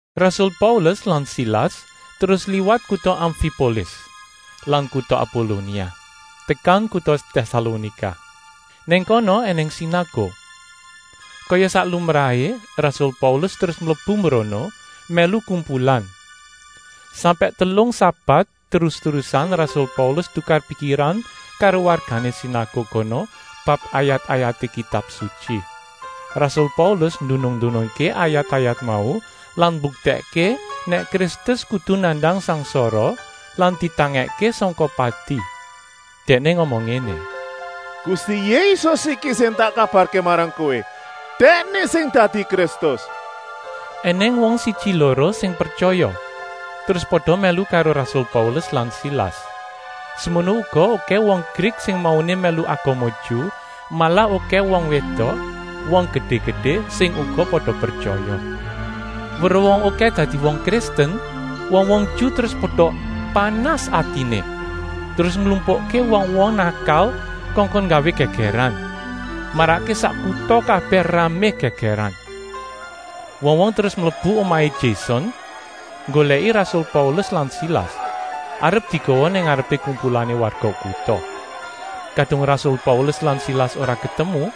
Rasul Paulus lan Silas terus liwat kuta Amfipolis lan kuta Apolonia tekan kuta Tèsalonika. Nang kono ènèng sinaguk. Kaya sak lumrahé rasul Paulus terus mlebu mbrono mèlu kumpulan. Sampèk telung sabat terus-terusan rasul Paulus tukar pikiran karo wargané sinaguk kono bab ayat-ayaté Kitab Sutyi. Rasul Paulus ndunung-ndunungké ayat-ayat mau lan mbuktèkké nèk Kristus kudu nandang sangsara lan ditangèkké sangka pati. Dèkné ngomong ngéné: “Gusti Yésus iki sing tak kabarké marang kowé, Dèkné sing dadi Kristus.” Enèng wong siji-loro sing pretyaya, terus pada mèlu karo rasul Paulus lan Silas; semono uga okèh wong Grik sing mauné mèlu agama Ju, malah okèh wong wédok, wong gedé-gedé, sing uga pada pretyaya. Weruh wong okèh dadi wong Kristen wong-wong Ju terus pada panas atiné. Terus nglumpukké wong-wong nakal kongkon nggawé gègèran, marakké sak kuta kabèh ramé gègèran. Wong-wong terus mlebu omahé Jason nggolèki rasul Paulus lan Silas, arep digawa nang ngarepé kumpulané warga kuta. Kadung rasul Paulus lan Silas ora ketemu,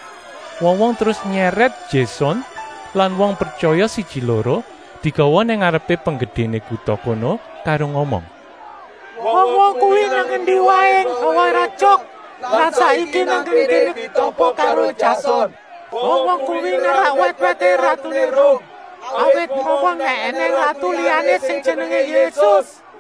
wong-wong terus nyèrèt Jason lan wong pretyaya siji-loro, digawa nang ngarepé penggedéné kuta kono karo ngomong: “Wong-wong kuwi nang endi waé nggawé rétyok lan saiki nang kéné ditampa karo Jason. Wong-wong kuwi nerak wèt-wèté ratuné Rum, awit ngomong nèk ènèng ratu liyané sing jenengé Yésus.”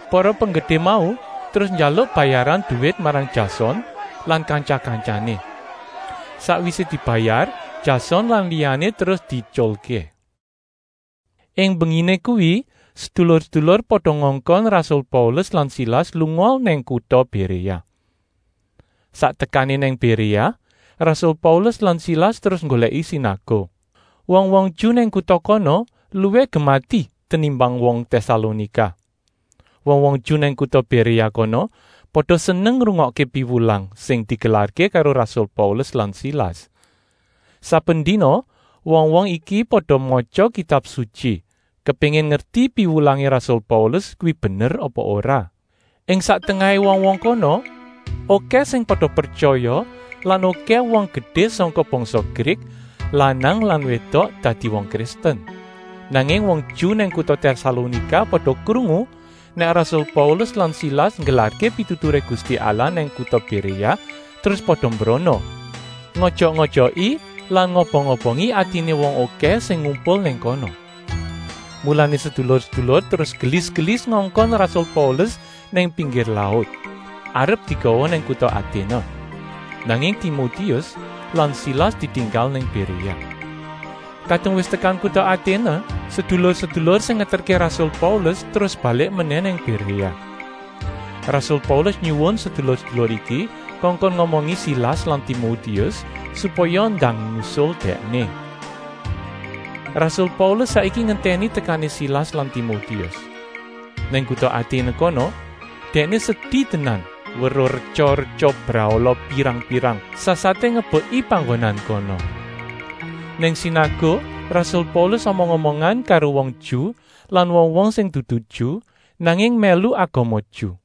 Para penggedé mau terus njaluk bayaran duwit marang Jason lan kantya-kantyané. Sakwisé dibayar, Jason lan liyané terus dietyulké. Ing mbenginé kuwi sedulur-sedulur pada ngongkon rasul Paulus lan Silas lunga nang kuta Béréa. Sak tekané nang Béréa rasul Paulus lan Silas terus nggolèki sinaguk. Wong-wong Ju nang kuta kono luwih gemati tenimbang wong Tèsalonika. Wong-wong Ju nang kuta Béréa kono pada seneng ngrungokké piwulang sing digelarké karo rasul Paulus lan Silas. Saben dina wong-wong iki pada matya Kitab Sutyi, kepéngin ngerti piwulangé rasul Paulus kuwi bener apa ora. Ing sak tengahé wong-wong kono okèh sing pada pretyaya lan okèh wong gedé sangka bangsa Grik, lanang lan wédok, dadi wong Kristen. Nanging wong Ju nang kuta Tèsalonika pada krungu nèk rasul Paulus lan Silas nggelarké pituturé Gusti Allah nang kuta Béréa, terus pada mbrono, ngojok-ojoki lan ngobong-obongi atiné wong okèh sing ngumpul nang kono. Mulané sedulur-sedulur terus gelis-gelis ngongkon rasul Paulus nang pinggir laut, arep digawa nang kuta Aténe, nanging Timotius lan Silas ditinggal nang Béréa. Kadung wis tekan kuta Aténe, sedulur-sedulur sing ngeterké rasul Paulus terus balik menèh nang Béréa. Rasul Paulus nyuwun sedulur-sedulur iki kongkon ngomongi Silas lan Timotius, supaya ndang nusul dèkné. Rasul Paulus saiki ngentèni tekané Silas lan Timotius. Nang kuta Aténe kono dèkné sedi tenan weruh retya-retya brahala pirang-pirang, sasaté ngebeki panggonan kono. Nang sinaguk rasul Paulus omong-omongan karo wong Ju lan wong-wong sing dudu Ju, nanging mèlu agama Ju.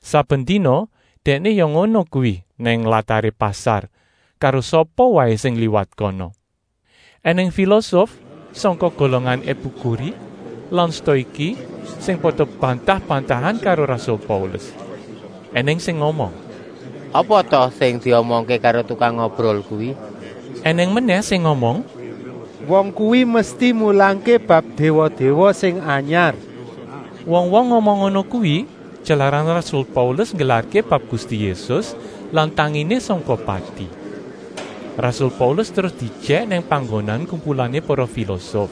Saben dina dèkné ya ngono kuwi nang lataré pasar, karo sapa waé sing liwat kono. Enèng filosof sangka golongan Epikuri lan Stoiki sing pada bantah-bantahan karo rasul Paulus. Enèng sing ngomong: “Apa ta sing diomongké karo tukang ngobrol kuwi?” Enèng menèh sing ngomong: “Wong kuwi mesti mulangké bab déwa-déwa sing anyar!” Wong-wong ngomong ngono kuwi, jalaran rasul Paulus nggelarké bab Gusti Yésus lan tanginé sangka pati. Rasul Paulus terus diejèk nang panggonan kumpulané para filosof,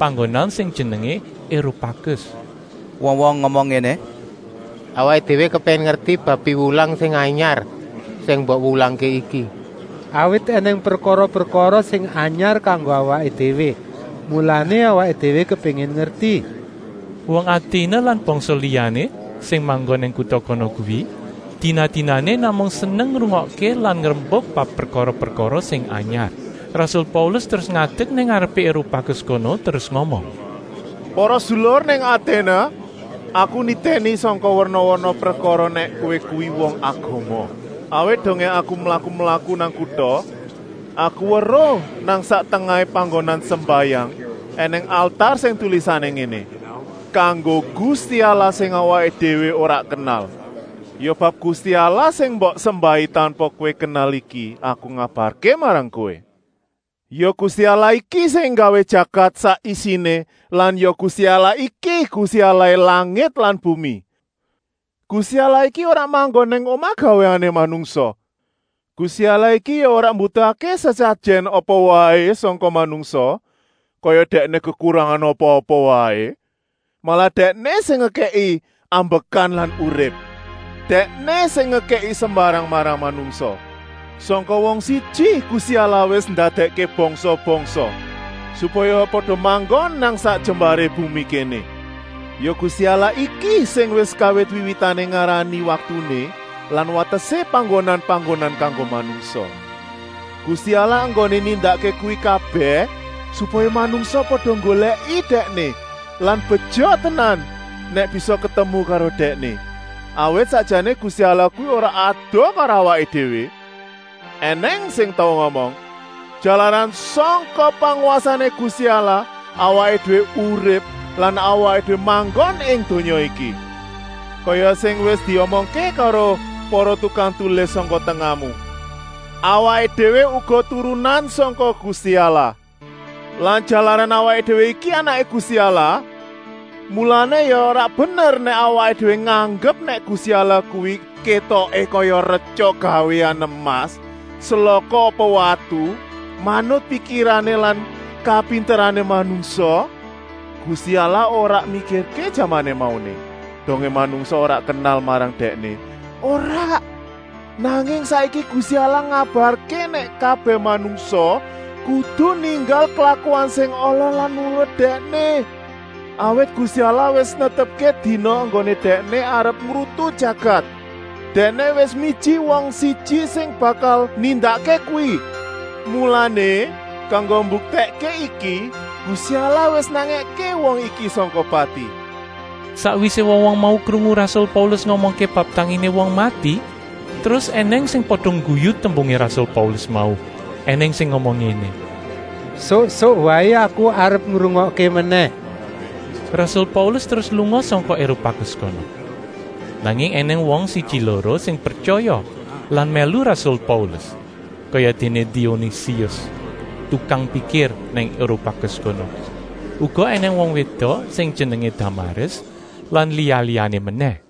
panggonan sing jenengé Eropakus. Wong-wong ngomong ngéné: “Awaké déwé kepéngin ngerti bab piwulang sing anyar sing mbok wulangké iki. Awit ènèng prekara-prekara sing anyar kanggo awaké déwé, mulané awaké déwé kepéngin ngerti.” Wong Aténe lan bangsa liyané sing manggon nang kuta kono kuwi dina-dinané namung seneng ngrungokké lan ngrembuk bab prekara-prekara sing anyar. Rasul Paulus terus ngadek nang ngarepé Eropakus kono terus ngomong: “Para sedulur nang Aténe! Aku nitèni sangka werna-werna prekara nèk kowé kuwi wong agama. Awit dongé aku mlaku-mlaku nang kuta, aku weruh nang sak tengahé panggonan sembayang ènèng altar sing tulisané ngéné: ‘Kanggo gusti allah sing awaké déwé ora kenal’. Ya bab Gusti Allah sing mbok sembahi tanpa kowé kenal iki aku ngabarké marang kowé. Ya Gusti Allah iki sing nggawé jagat sak isiné. Lan ya Gusti Allah iki Gusti Allahé langit lan bumi. Gusti Allah iki ora manggon nang omah gawéané manungsa. Gusti Allah iki ya ora mbutuhké sesajèn apa waé sangka manungsa, kaya Dèkné kekurangan apa-apa waé. Malah Dèkné sing ngekèki ambekan lan urip; Dèkné sing ngekèki sembarang marang manungsa. Sangka wong siji Gusti Allah wis ndadèkké bangsa-bangsa, supaya pada manggon nang sak jembaré bumi kéné. Ya Gusti Allah iki sing wis kawit wiwitané ngarani waktuné lan watesé panggonan-panggonan kanggo manungsa. Gusti Allah enggoné nindakké kuwi kabèh, supaya manungsa pada nggolèki Dèkné lan beja tenan nèk bisa ketemu karo Dèkné. Awit sakjané Gusti Allah kuwi ora adoh karo awaké déwé. Enèng sing tau ngomong: ‘Jalaran sangka pangwasané Gusti Allah awaké déwé urip lan awaké déwé manggon ing donya iki.’ Kaya sing wis diomongké karo para tukang tulis sangka tengahmu: ‘Awaké déwé uga turunan sangka Gusti Allah.’ Lan jalaran awaké déwé iki anaké Gusti Allah, mulané ya ora bener nèk awaké déwé nganggep nèk Gusti Allah kuwi kétoké kaya retya gawéan emas, selaka apa watu, manut pikirané lan kapinterané manungsa. Gusti Allah ora mikirké jamané mauné, dongé manungsa ora kenal marang Dèkné, ora, nanging saiki Gusti Allah ngabarké nèk kabèh manungsa kudu ninggal klakuan sing ala lan nurut Dèkné. Awit Gusti Allah wis netepké dina enggoné Dèkné arep ngrutu jagat; Dèkné wis miji wong siji sing bakal nindakké kuwi. Mulané, kanggo mbuktèkké iki Gusti Allah wis nangèké wong iki sangka pati.” Sakwisé wong-wong mau krungu rasul Paulus ngomongké bab tanginé wong mati, terus ènèng sing pada ngguyu tembungé rasul Paulus mau, ènèng sing ngomong ngéné: “Suk-suk waé aku arep ngrungokké menèh.” Rasul Paulus terus lunga sangka Eropakus kono. Nanging ènèng wong siji-loro sing pretyaya lan mèlu rasul Paulus, kayadéné Dionisius, tukang pikir nang Eropakus kono, uga ènèng wong wédok sing jenengé Damaris lan liya-liyané menèh.